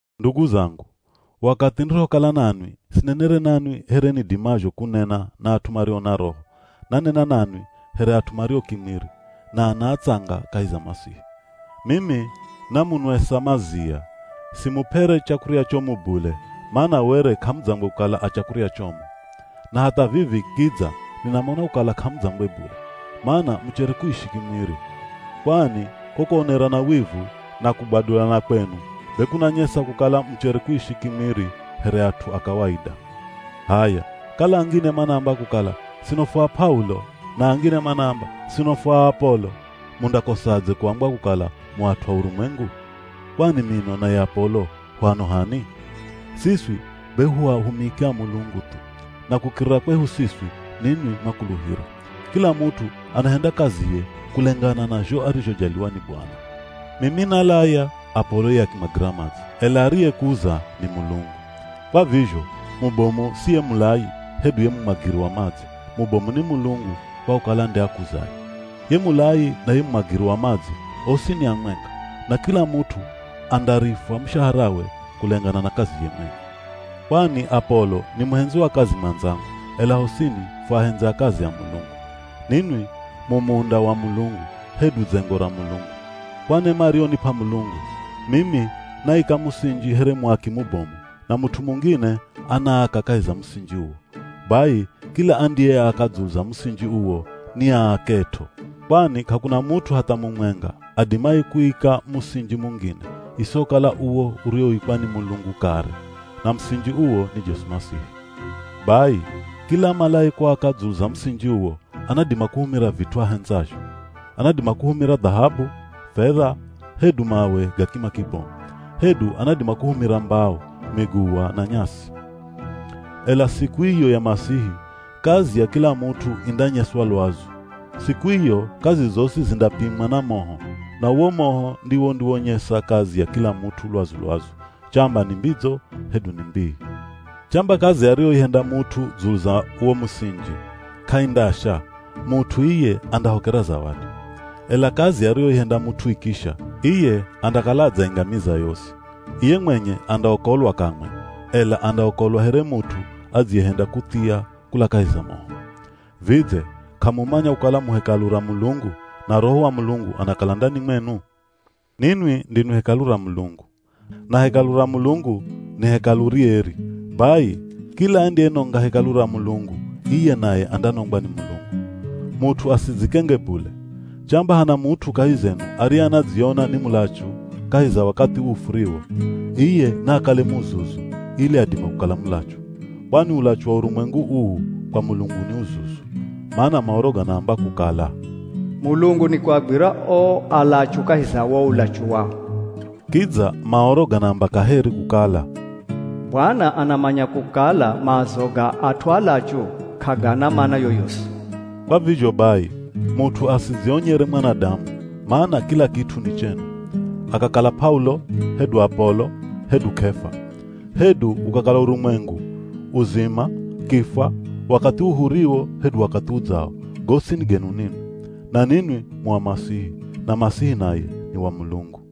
Ndugu zangu, wakathi nirihokala nanwi sinenere nanwi here nidimazho kunena na at'u mario na Roho, nanena nanwi here at'u mario kimwiri, na ana atsanga kahi za Masihi. Mimi namunwesa mazia, simup'ere chakurya chomu bule mana were k'amudzangwe kukala a chakurya chomu. Na hatha vivi kidza ninamona kukala k'amudzangwe bule, mana muchere kuishi kimwiri. Kwani ko kuonerana wivu na kugwadulana kwenu be kunanyesa kukala muchere kuishi kimwiri here at'u a kawaida. H'aya kala angine manaamba kukala, “Sino fu a P'aulo,” na angine manaamba, “Sino fu a Apolo,” mundakosadze kuambwa kukala mu at'u a urumwengu? Kwani mino na ye Apolo hu ano h'ani? Siswi be hu ahumiki a Mulungu thu, na kukirira kwehu siswi ninwi mwakuluhira. Kila mut'u anahenda kaziye kulengana na zho arizhojaliwa ni Bwana. Mimi nalaya, Apolo ye akimwagira madzi, ela ariyekuza ni Mulungu. Kwa vizho, mubomu si ye mulayi, hedu ye mumwagiri wa madzi, mubomu ni Mulungu kwa kukala nde akuzaye. Ye mulayi na ye mumwagiri wa madzi osi ni amwenga, na kila mut'u andarifwa mushaharawe kulengana na kaziye mwenye. Kwani Apolo ni muhendzi wa kazi mwandzangu, ela hosini fu ahendzi a kazi a Mulungu. Ninwi mu munda wa Mulungu, hedu dzengo ra Mulungu. Kwa nema ariyonip'a Mulungu, mimi naika musinji here muaki mubomu, na mut'u mungine anaaka kahi za musinji uwo. Bai kila andiyeaka dzulu za musinji uwo niaaket'o. Kwani k'akuna mut'u hatha mumwenga adimaye kuika musinji mungine, isihokala uwo uriwoikwa ni Mulungu kare. Na musinji uwo ni Jesu Masihi. Bai, kila amalaye kuaka dzulu za musinji uwo, anadima kuhumira vit'u ahendzazho. Anadima kuhumira dhahabu, fedha, hedu mawe ga kima kibomu. Hedu anadima kuhumira mbao, miguwa, na nyasi. Ela siku iyo ya Masihi, kazi ya kila mut'u indanyeswa lwazu. Siku iyo kazi zosi zindapimwa na moho, na uwo moho ndiwo undiwonyesa kazi ya kila mut'u lwazu-lwazu, chamba ni mbidzo hedu ni mbii. Chamba kazi ariyoihenda mut'u dzulu za wo musinji k'aindasha, mut'u iye andahokera zawadi. Ela kazi ariyoihenda mut'u ikisha, iye andakala adzaingamiza yosi. Iye mwenye andaokolwa kamwe ela andaokolwa here mut'u adziyehenda kuthia kula kahi za moho. Vidze, k'amumanya kukala mu hekalu ra Mulungu, na Roho wa Mulungu anakala ndani mwenu? Ninwi ndinwi hekalu ra Mulungu, na hekalu ra Mulungu ni hekalu rieri. Bai, kila andiyenonga hekalu ra Mulungu iye naye andanongwa ni Mulungu. Mut'u asidzikenge bule. Chamba hana mut'u kahi zenu ariye anadziona ni mulachu kahi za wakathi uu furiwo, iye naakale muzuzu ili adime kukala mulachu. Kwani ulachu wa urumwengu uu kwa Mulungu ni uzuzu. Mana Maoro ganaamba kukala, “Mulungu nikuagwira o alachu kahi za wo ulachu wao.” Kidza Maoro ganaamba kaheri kukala, “Bwana anamanya kukala maazo ga at'u alachu k'agana mana yoyosi.” Kwa vizho bai, mut'u asidzionyere mwanadamu, mana kila kit'u ni chenu. Akakala P'aulo, hedu Apolo, hedu K'efa. Hedu ukakala urumwengu, uzima, kifwa, wakathi uu huriwo hedu wakathi udzao, gosi ni genu ninwi. Na ninwi mu a Masihi, na Masihi naye ni wa Mulungu.